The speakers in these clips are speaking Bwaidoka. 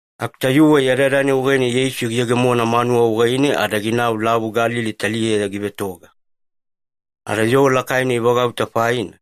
Aku tayuwe yadayada-nai wagaine Yeisu giyegemona manuwa wagaine ada ginau Lavu Galili taliyeya givetoga. Ada yoo lakaina ivagauta faina,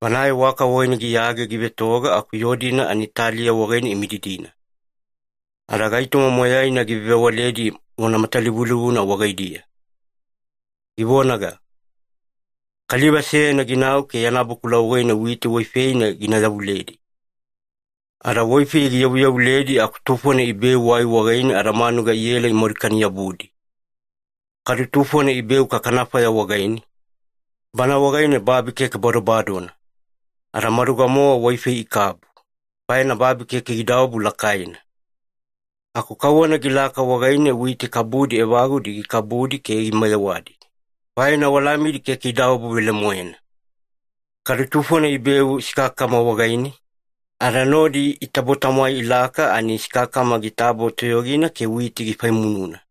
banae waka wagaine giyage givetoga aku yoo-dina ani taliya wagaine imididina. Ada gaitoma moyaina givewavewaledi vona matalivulivuna wagaidiya, givonaga, “Kaliva seyana ginau ke yana bakula wagaine witi waifeina gina yavuledi. Ada waifei giyavuyavuledi aku tufona ibeu wai wagaine, ada manuga iela imadukani-yabudi. Kadu tufona ibeu kakanafaya wagaine, bana wagaine babi keke badobadona. Ada maduga-mowa waifei ikabu, faina babi keke gidaobu lakaina. Aku kauwana gilaka wagaine witi kabudi evagudi gikabudi ke imayewadi, faina walamidi keke idaobu velemoena. Kadu tufona ibeu sikakakama wagaine, ada nodi itabo-tamwai ilaka ani sikakakama gitabo toyogina ke witi gifaimununa.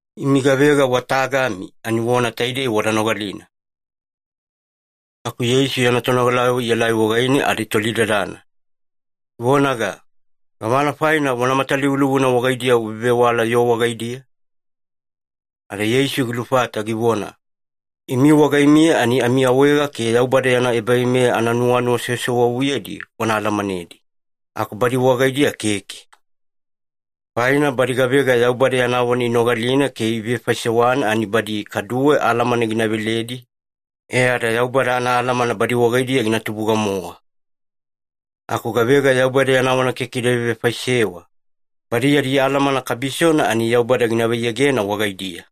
Imi gavega wa tagami ani vona taidei wada nogalina.” Aku Yeisu yana tonogalayavo ielai wagaine ada itolidadana, ivonaga, “Gavana faina vona matalivulivuna wagaidiya uvevewala yoo wagaidiya?” Ada Yeisu gilufata givona, “Imi wagaimiya ani amiawaega ke Yaubada yana ebaveimeya ananuwanuwa sewasewavuyedi wana alamanedi. Aku badi wagaidiya keke. Faina badi gavega Yaubada yana vona inogalina ke ivevefaisewana ani badi kaduwe alamana gina veledi, e ada Yaubada anaalamana badi wagaidiya gina tubuga-mowa. Aku gavega Yaubada yana vona keke ida vevefaisewa, badi yadi alamana kabisona ani Yaubada gina vaiyegena wagaidiya.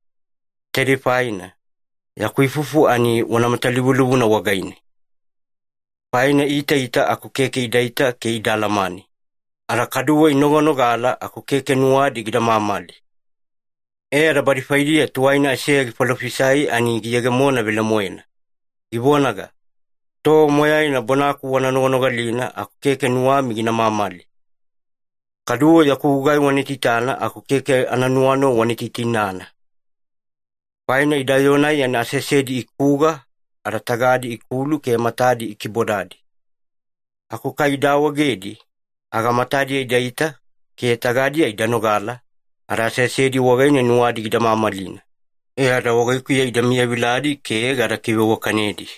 Taidei faina, yaku ifufu ani vona matalivulivuna wagaine. ‘Faina iitaita aku keke idaita ke ida alamane, ada kaduwe inoganogala aku keke nuwadi gida mamali.’ E ada badi faidiya tuwaina Aiseya gifalofisai ani giyegemona velemoena, givonaga, ‘Tova moyaina bonaku wana noganogalina aku keke nuwami gina mamali. Kaduwe yaku gugai wana itaitana aku keke ananuwanuwa wana itainana. Faina ida yoo-nai ani aseasedi ikuga, ada tagadi ikulu, ke matadi ikibodadi. Aku kai ida awaegedi, aga matadiya idaita, ke tagadiya ida nogala, ada aseasedi wagaine nuwadi gida mamalina, e ada wagaikuya ida miyaviladi ke gada kiveiwakanedi.’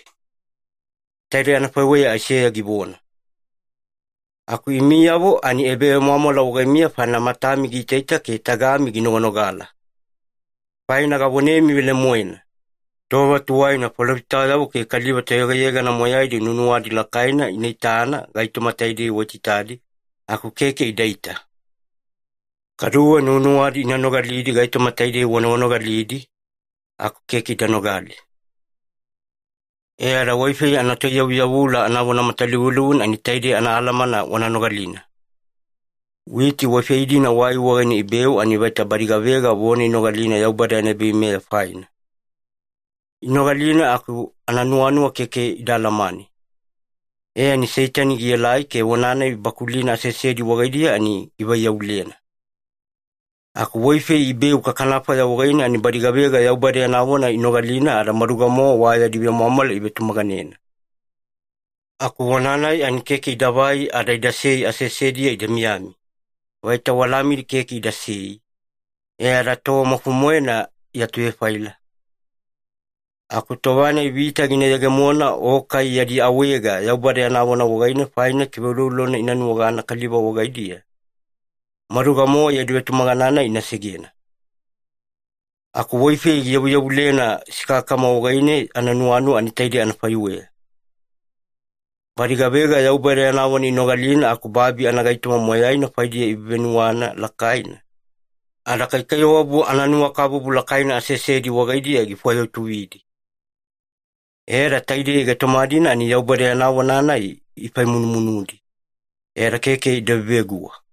Taidei anafaiweya Aiseya givona. “Aku imiyavo ani ebavemwamwala wagaimiya, faina matami giitaita ke tagami ginoganogala. Faina gavonemi velemoena, tova tuwaina falofitayavo ke kaliva toyegayegana moyaidi nuwanuwadi lakaina ina itana gaitoma taidei waitaitadi, aku keke idaita. Kaduwe nuwanuwadi ina nogalidi gaitoma taidei wanoganogalidi, aku keke ida nogali. “E ada waifei anatoiyavuyavula anavona matalivulivuna, ani taidei anaalamana wana nogalina. Witi waifei-dina wai wagaine ibeu, ani vaita badi gavega vona inogalina Yaubada yana ebaveimeya faina. Inogalina aku ananuwanuwa keke ida alamane, e ani Seitani gielai ke vona-nai ibakulina aseasedi wagaidiya ani givaiyavulena. Aku waifei ibeu kakanafaya wagaine, ani badi gavega Yaubada yana vona inogalina ada maduga-mowa wa yadi vemwamwala ivetumaganena. Aku vona-nai ani keke idavai ada idasei aseasediya ida miyami. Vaita walamidi keke idasei, e ada tova maufo-moena iatuvefaila. Aku tova-nai vita gina yegemona, o kai yadi awaega Yaubada yana vona wagaine faina, kiveuloulolona ina nuwagana kaliva wagaidiya, maduga-mowa yadi vetumagana-nai ina segena. Aku waifei giyavuyavulena sikakakama wagaine ananuwanuwa ani taidei anafaiweya. Badi gavega Yaubada yana vona inogalina aku babi anagaitoma moyaina faidiya ivevenuwana lakaina, ada kaikaiwabu ananuwakabubu lakaina aseasedi wagaidiya gifwayautuvidi. E ada taidei gaitoma-dina ani Yaubada yana vona-nai ifaifaimunudi, ada keke ida veveguwa.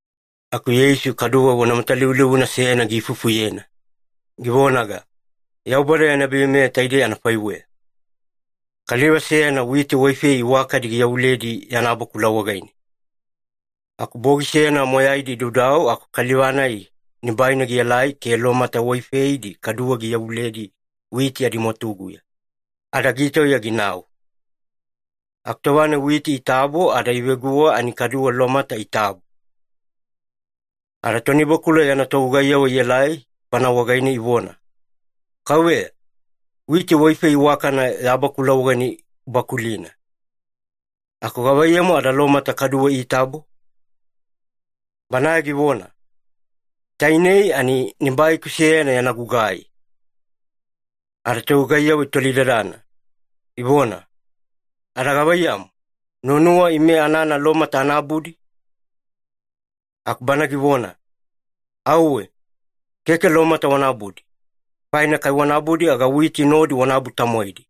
Aku Yeisu kaduwe vona matalivulivuna seyana giifufuyena, givonaga, “Yaubada yana ebaveimeya taidei anafaiweya. Kaliva seyana witi waifei iwakadi giyavuledi yana bakula wagaine. Aku bogi seyana moyaidi idaudau aku kaliva-nai nibaina gielai ke lomata waifeidi kaduwe giyavuledi witi adimwatuguya, ada gitauya ginau. Aku tova-nai witi itabo ada iveguwa, ani kaduwe lomata itabo. “Ada tonibakula yana togugaiyavo ielai bana wagaine ivona, ‘Kauveya, witi waifei iwakana ya bakula wagaine ubakulina, aku gavaiyamu ada lomata kaduwe itabo?’ “Banae givona, ‘Tainei ani nibaiku seyana yana gugai.’ “Ada togugaiyavo itolidadana, ivona, ‘Ada gavaiyamu, nuwanuwa ime anana lomata ana abudi?’ “Aku bana givona, ‘Auwe, keke lomata wana abudi. Faina kai wana abudi aga witi nodi wana abu-tamwaidi.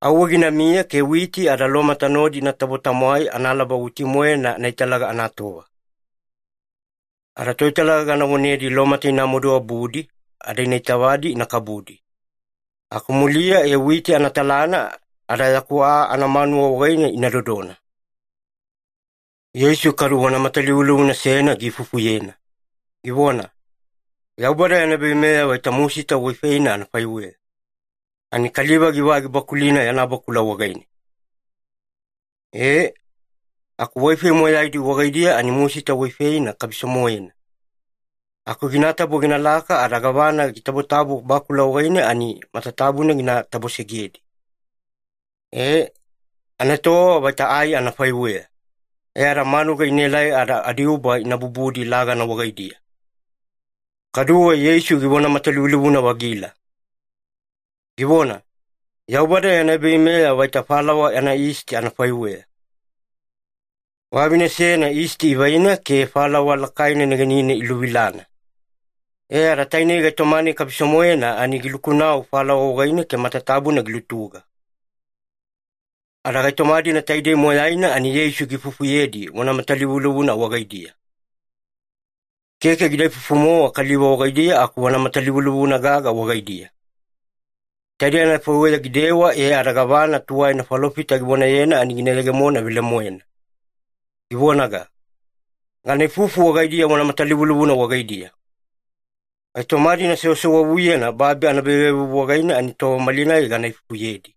Auwe ginamiya ke witi ada lomata nodi inatabo-tamwai analaba witi-moena anaitalaga anatova. Ada toitalaga gana vonedi lomata ina maduabudi, ada ina itavadi ina kabudi. Aku muliya e witi ina talana ada yaku aa anamanuwa wagaine ina dodona.’” Yeisu kadu vona matalivulivuna seyana giifufuyena, givona, “Yaubada yana ebaveimeya vaita musita waifeina anafaiweya, ani kaliva givai gibakulina yana bakula wagaine. E, aku waifei moyaidi wagaidiya ani musita waifeina kabiso-moena, aku ginatabo ginalaka ada gavana gitabotabo bakula wagaine ani matatabuna gina tabosegedi. E, anaetowava vaita ai anafaiweya, e ada manuga inaelai ada adiuba ina bubudi lagana wagaidiya.” Kaduwe Yeisu givona matalivulivuna-vagila, givona, “Yaubada yana ebaveimeya vaita falawa anayisti anafaiweya. Vavine seyana yisti ivaina ke falawa lakaina negenine iluvilana. E ada tainei gaitoma-nai kabiso-moena ani giluku-nau falawa wagaine ke matatabuna gilutuga.” Ada gaitoma-dina taidei moyaina ani Yeisu giifufuyedi vona matalivulivuna wagaidiya. Keke gida ifufu-mowa kaliva wagaidiya aku vona matalivulivuna gaga wagaidiya. Taidei anafaiweya gidewa e ada gavana tuwaina falofita givonayena ani gina yegemona velemoena, givonaga, “Gana ifufu wagaidiya vona matalivulivuna wagaidiya. Gaitoma-dina sewasewavuyena babi anaebavevuvu wagaine, ani tova malinai gana ifufuyedi.”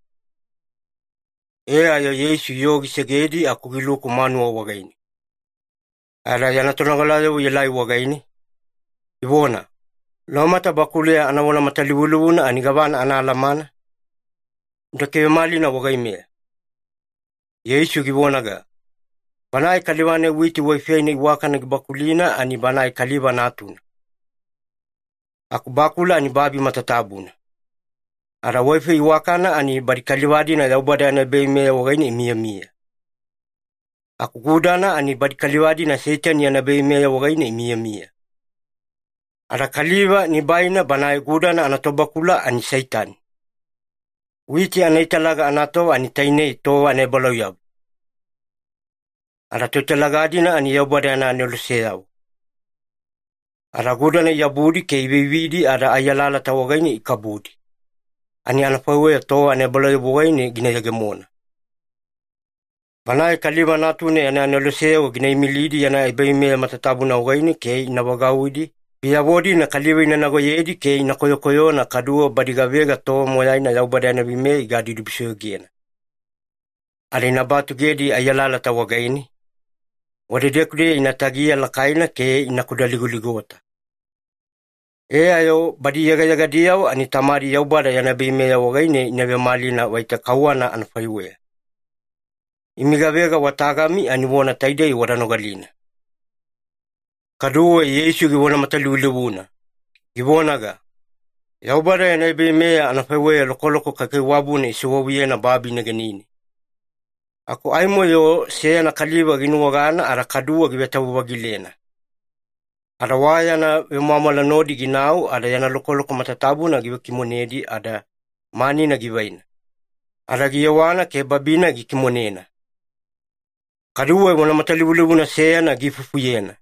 E ayo Yeisu yoo gisegedi aku giluku manuwa wagaine. Ada yana tonogalayavo ielai wagaine, ivona, “Lomata bakuleya anavona matalivulivuna ani gavana anaalamana? Uda kivemalina wagaimeya.” Yeisu givonaga, “Banae kaliva-nai witi waifeina iwakana gibakulina ani Banae Kaliva Natuna. Aku bakula ani babi matatabuna, ada waifei iwakana ani badi kaliva-dina Yaubada yana ebaveimeya wagaine imiyamiya. Aku gudana ani badi kaliva-dina Seitani yana ebaveimeya wagaine imiyamiya. Ada kaliva nibaina banae gudana anatobakula ani Seitani. Witi anaitalaga anatova ani tainei tova anaebalauyabu, ada toitalaga-dina ani Yaubada yana aneloseyavo. Ada gudana iabudi ke iveividi ada ai alalata wagaine ikabudi, ani anafaiweya tova anaebalauyabu wagaine gina yegemona. Banae Kaliva Natuna yana aneloseyavo gina imilidi yana ebaveimeya matatabuna wagaine ke ina vagauwidi biyavo-dina kaliva inagonagoyedi ke ina koyokoyona, kaduwe badi gavega tova moyaina Yaubada yana veimeya igadibudibusoyogena. Ada ina batugedi ai alalata wagaine, wadedeku-deya ina tagiya lakaina ke ina kudaligoligota. E ayo badi yegayegadiyavo, ani Tamadi Yaubada yana ebaveimeya wagaine ina vemalina vaita kauwana anafaiweya. Imi gavega wa tagami ani vona taidei wada nogalina.” Kaduwe Yeisu givona matalivulivuna, givonaga, “Yaubada yana ebaveimeya anafaiweya lokoloko kaikaiwabuna isewavuyena babi negenine. Aku aimo-yo seyana kaliva ginuwagana ada kaduwe givetavu-vagilena. Ada wa yana vemwamwala nodi ginau ada yana lokoloko matatabuna givekimonedi ada manina givaina, ada giyewana ke babi-nai gikimonena.” Kaduwe vona matalivulivuna seyana giifufuyena,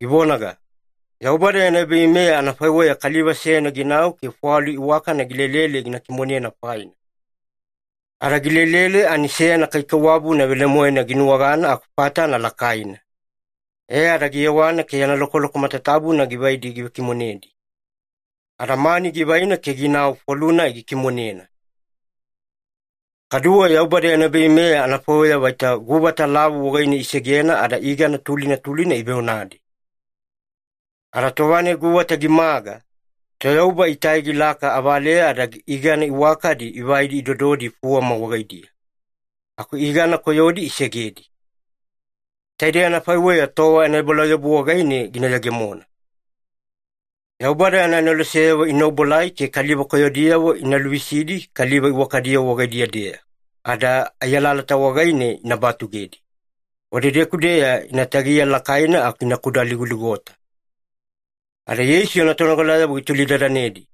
givonaga, “Yaubada yana ebaveimeya anafaiweya kaliva seyana ginau ke fwalu iwakana gilelele gina kimonena faina. Ada gilelele ani seyana kaikaiwabuna velemoena ginuwagana aku fatana lakaina. E ada giyewana ke yana lokoloko matatabuna givaidi givekimonedi, ada mani givaina ke ginau fwalu-nai gikimonena.” “Kaduwe Yaubada yana ebaveimeya anafaiweya vaita guvata lavu wagaine isegena ada igana tulina tulina iveonadi. Ada tova-nai guvata gimaga, toyauba itai gilaka avaleya ada igana iwakadi ivaidi idododi fuwama wagaidiya. Aku igana koyodi isegedi. Taidei anafaiweya tova anaebalauyabu wagaine gina yegemona. Yaubada yana aneloseyavo ina obuelai ke kaliva koyodiyavo ina luvisidi kaliva iwakadiyavo wagaidiya-deya, ada ai alalata wagaine ina batugedi. Wadedeku-deya ina tagiya lakaina aku ina kudaligoligota.” Ada Yeisu yana tonogalayavo gitolidadanedi,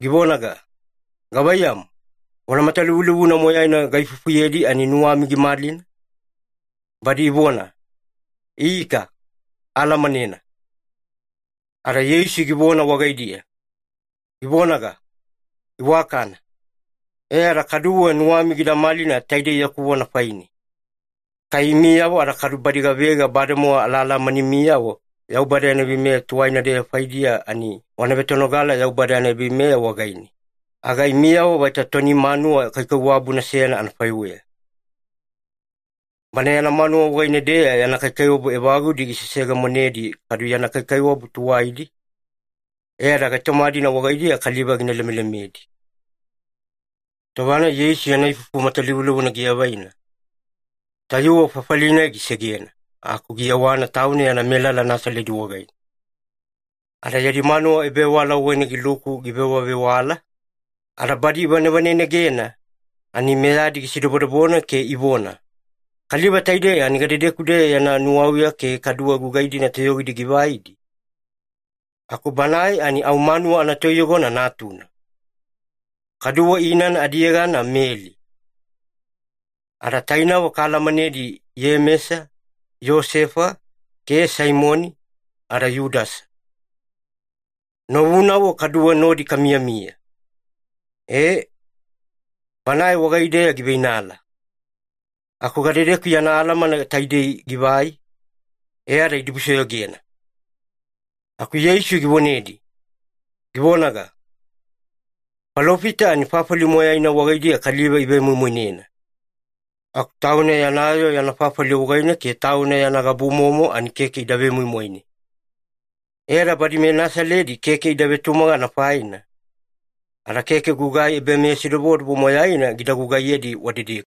givonaga, “Gavaiyamu, vona matalivulivuna moyaina gaifufuyedi ani nuwami gimalina?” Badi ivona, “Ika, aalamanena.” Ada Yeisu givona wagaidiya, givonaga, “Iwakana. E ada kaduwe nuwami gida malina taide yaku vona faine. Kai imiyavo ada kadu badi gavega bademowa alaalamanimiyavo Yaubada yana veimeya tuwaina-deya faidiya ani wana vetonogala Yaubada yana ebaveimeya wagaine, aga imiyavo vaita toni manuwa kaikaiwabuna seyana anafaiweya. Bana yana manuwa wagaine-deya yana kaikaiwabu evagudi giseseyegemonedi kadu yana kaikaiwabu tuwaidi, e ada gaitoma-dina wagaidiya kaliva gina lemelemedi.” Tova-nai Yeisu yana ifufu matalivulivuna giavaina, tayuwe fafali-nai gisegena aku giyewana tauna yana melala Nasaledi wagaine. Ada yadi manuwa ebavewala wagaine giluku givewavewala, ada badi ivanevanenegena ani meyadi gisidobodobona ke ivona, “Kaliva taidei ani gadedeku-deya yana nuwauya ke kaduwe gugai-dina toyogidi givaidi? Aku banae ani au manuwa anatoiyogona natuna, kaduwe inana adiyegana Meli. Ada tainavo kaalamanedi Iyemesa, Iyosefa, ke Saimoni, ada Yudasa. Novunavo kaduwe nodi kamiyamiya. E, banae wagaideya giveinala. Aku gadedeku yana alamana taidei givai?” E ada idibusoyogena. Aku Yeisu givonedi, givonaga, “Falofita ani fafali moyaina wagaidiya kaliva ivemoimoinena. Aku tauna yana yoo yana fafali wagaine ke tauna yana gabumomo ani keke ida vemoimoine.” E ada badi meNasaledi keke ida vetumagana faina, ada keke gugai ebameyasidobodobo moyaina gida gugaiyedi wadedeku.